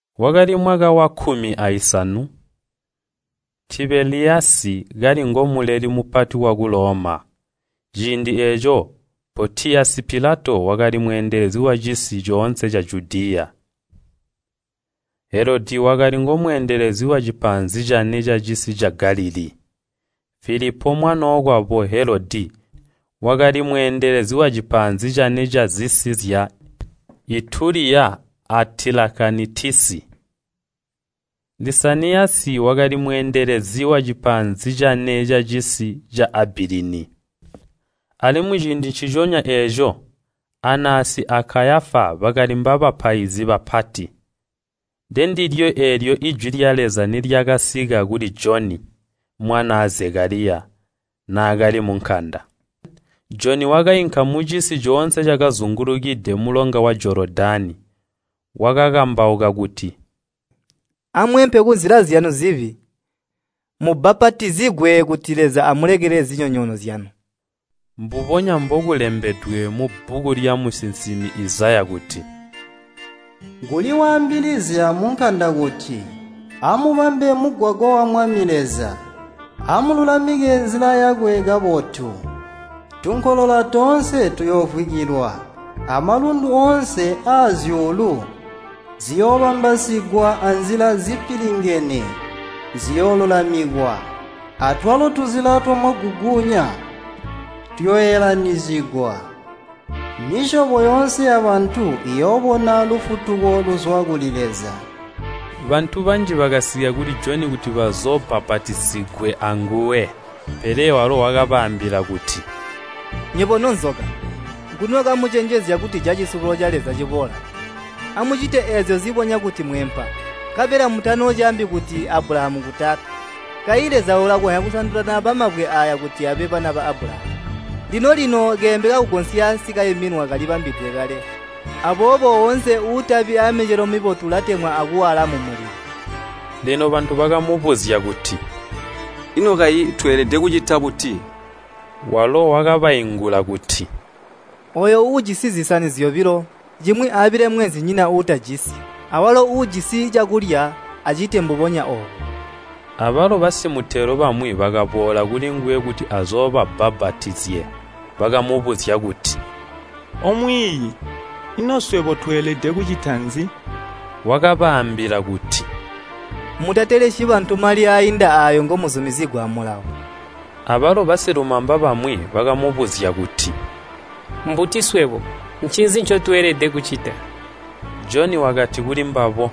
Wakali mwaka wakkumi aisanu Tibeliyasi kali ngo Muleli Mupati waku Loma, ciindi eeco Pontiyasi Pilato wakali mweendelezi wacisi coonse ca Judiya. Helodi wakali ngomwami wacisi ca Galilii. Filipo, mwanookwabo Helodi, wakali mwami wazisi zya Ituliya a Tilakanitisi. Lisaniyasi wakali mwami wacisi ca Abilini. Alimwi ciindi nciconya eeco Anasi a Kayafa bakali mbabapaizi bapati. Ndendilyo eelyo ijwi lya Leza nilyakasika kuli Joni, mwanaa Zekaliya, naakali munkanda. Joni wakainka mucisi coonse cakazingulukide mulonga wa Jolodani. Wakakambauka kuti, “Amweempe kunzila zyanu zibi, mubbapatizigwe kuti Leza amulekelele zinyonyoono zyanu.” Mbubonya mbokulembedwe mubbuku lyamusinsimi Izaya kuti, “Kuli waambilizya munkanda kuti, ‘Amubambe mugwagwa wa Mwami Leza! Amululamike nzila yakwe kabotu. Tunkolola toonse tuyoovwikilwa, amalundu oonse azyuulu ziyoobambasigwa anzila zipilingene ziyoolulamikwa, atwalo tuzila twamaguguunya tuyooelanyizigwa. Misyobo yoonse yabantu iyoobona lufutuko luzwa kuli Leza!’” Bantu banji bakasika kuli Joni kuti bazoobbapatizigwe anguwe. Pele walo wakabaambila kuti, “Nywebo nobacipile! Nguni wakamucenjezya kutija cisubulo ca Leza ciboola? Amucite eezyo zibonya kuti mweempa. Nkabela mutanoocaambi kuti, ‘Abulahamu ngu taata.’ Kayi Leza ulakonzya kusandula naaba mabwe aaya kuti abe bana ba Abulahamu. Lino-lino keembe kakugonsya sikaiminwa, kalibambilidwe kale, aboobo woonse uutabi aamicelo mibotu ulatemwa akuwaala mumulilo.” Lino bantu bakamubuzya kuti, “Ino kayi tweelede kucita buti?” Walo wakabaingula kuti, “Ooyo uujisi zisani zyobilo, cimwi aabile mweenzinyina uutajisi, awalo uujisi cakulya acite mbubonya oobo.” Abalo basimitelo bamwi bakaboola kulinguwe kuti azoobabbapatizye. Bakamubuzya kuti, “Omwiiyi, ino swebo tweelede kucita nzi?” Wakabaambila kuti, “Mutatelesyi bantu mali aainda aayo ngomuzumizigwa amulawo.” Abalo basilumamba bamwi bakamubuzya kuti, “Mbuti swebo? Ncinzi ncotweelede kucita?” Joni wakati kulimbabo,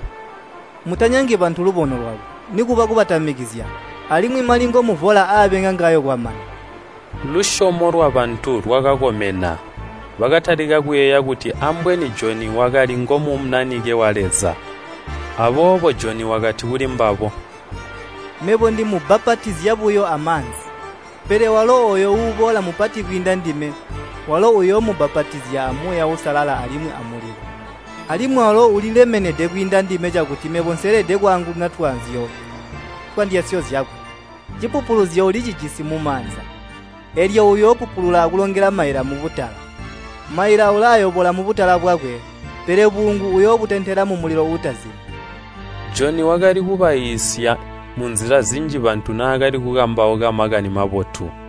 “Mutanyangi bantu lubono lwabo, nikuba kubatamikizya. Alimwi mali ngomuvola aabe ngangawo kwamana.” Lusyomo lwabantu lwakakomena, bakatalika kuyeeya kuti ambweni Joni wakali ngo Munanike wa Leza. Aboobo Joni wakati kulimbabo, “Mebo ndimubbapatizya buyo amaanzi, pele walo ooyo uuboola mupati kapati kwiinda ndime, walo uyoomubbapatizya a Muuya Uusalala alimwi amulilo. Alimwi walo ulilemenede kwiinda ndime cakuti mebo nseelede kwaangununa twaanzyo twandyasyo zyakwe. Cipupuluzyo ulicijisi mumaanza, eelyo uyoopupulula akulongela maila mubutala. Maila ulaayobola mubutala bwakwe, pele buungu uyoobutentela mumulilo uutazimi!” Joni wakali kubaiisya munzila zinji bantu naakali kukambauka Makani Mabotu.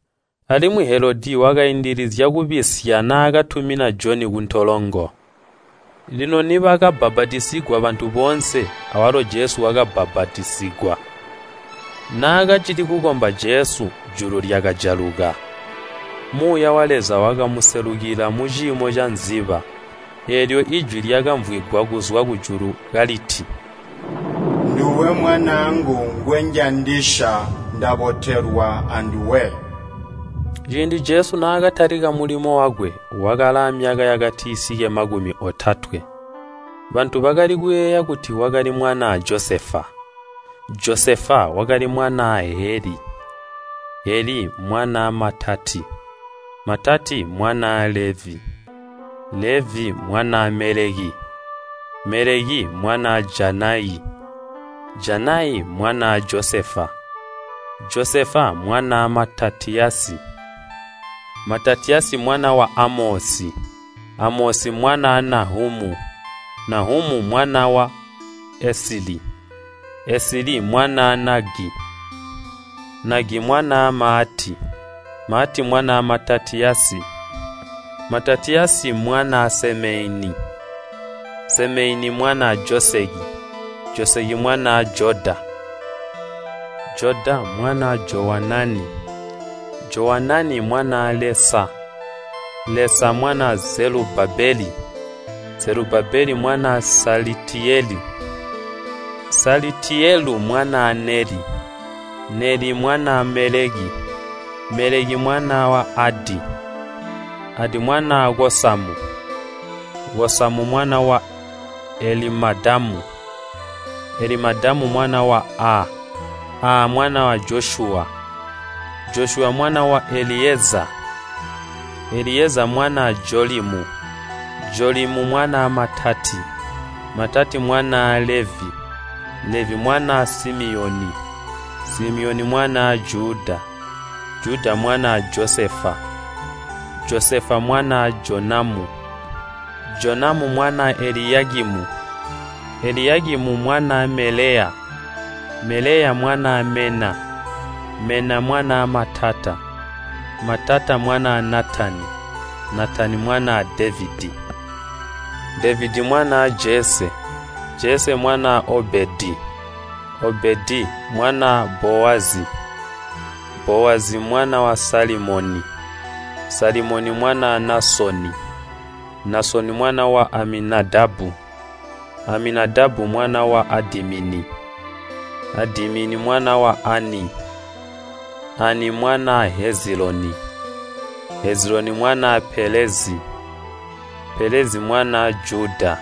Alimwi Helodi wakaindizya kubisya naakatumina Joni kuntolongo. Lino nibakabbapatizigwa bantu boonse, awalo Jesu wakabbapatizigwa. Naakacili kukomba Jesu, julu lyakajaluka, Muuya wa Leza wakamuselukila muciimo cankwilimba, eelyo ijwi lyakamvwigwa kuzwa kujulu kaliti, “Nduwe Mwanaangu ngwenjandisya ndabotelelwa anduwe.” Ciindi Jesu naakatalika mulimo wakwe, wakali aamyaka yakatisike makumi otatwe, bantu bakali kuyeeya kuti wakali mwanaa Josefa, Josefa wakali mwanaa Heli, Heli mwanaa Matati mwanaa Levi, Levi mwanaa Meleki, Meleki mwanaa Janayi, Janayi mwanaa Josefa, Josefa mwanaa Matatiyasi, Matatiyasi mwana wa Amosi, Amosi mwanaa Nahamu, Nahamu mwana wa Esili, Esili mwanaa Nagi, Nagi mwanaa Maati, Maati mwanaa Matatiyasi, Matatiyasi mwanaa Semeini, Semeini mwanaa Joseki, Joseki mwanaa Joda, Joda mwanaa Jowanani, Jowanani mwanaa Lesa, Lesa mwanaa Zelubabeli, Zelubabeli mwanaa Salitiyelu, Salitiyelu mwanaa Neli, Neli mwanaa Meleki, Meleki mwana wa Adi, Adi mwanaa Kosamu, Kosamu mwana wa Elimadamu, Elimadamu mwana wa Aa, Aa mwanaa Josyuwa, Josyuwa mwana wa Eliyezaa, Eliyezaa mwanaa Jolimu, Jolimu mwanaa Matati, Matati mwanaa Levi, Levi mwanaa Simiyoni, Simiyoni mwanaa Juda, Juda mwanaa Josefa, Josefa mwanaa Jonamu, Jonamu mwanaa Eliyakimu, Eliyakimu mwanaa Melea, Melea mwanaa Mena, Mena mwanaa Matata, Matata mwanaa Natani, Natani mwanaa Devedi, Devedi mwanaa Jese, Jese mwanaa Obedi, Obedi mwanaa Bowazi, Bowazi mwanaa Salimoni, Salimoni mwanaa Naasoni, Naasoni mwana wa Aminadabu, Aminadabu mwana wa Adimini, Adimini mwana wa Aani, Aani mwanaa Heziloni, Heziloni mwanaa Pelezi, Pelezi mwanaa Juda,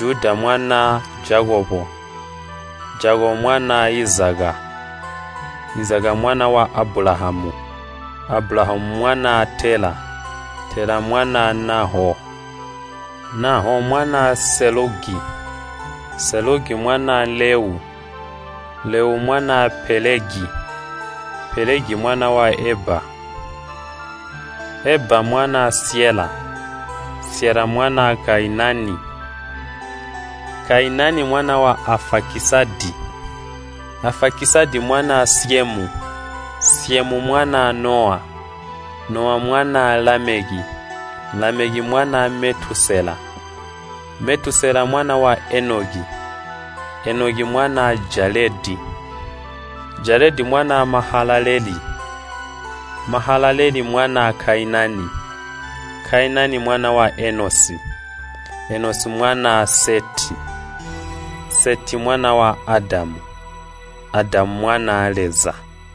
Juda mwanaa Jakobo, Jakobo mwanaa Izaka, Izaka mwana wa Abulahamu, Abulahamu mwanaa Tela, Tela mwanaa Nahoo, Nahoo mwanaa Selugi, Selugi mwanaa Leu, Leu mwanaa Pelegi, Pelegi mwana wa Eba, Eba mwanaa Syela, Syela mwanaa Kainani, Kainani mwana wa Aafakisadi, Afakisadi mwanaa Syemu, Syemu mwanaa Nowa, Nowa mwanaa Lameki, Lameki mwanaa Metusela, Metusela mwana wa Enoki, Enoki mwanaa Jaledi, Jaledi mwanaa Mahalaleeli, Mahalaleeli mwanaa Kainani, Kainani mwana wa Enosi mwanaa Seti, Seti mwana wa Adamu, Adamu mwanaa Leza.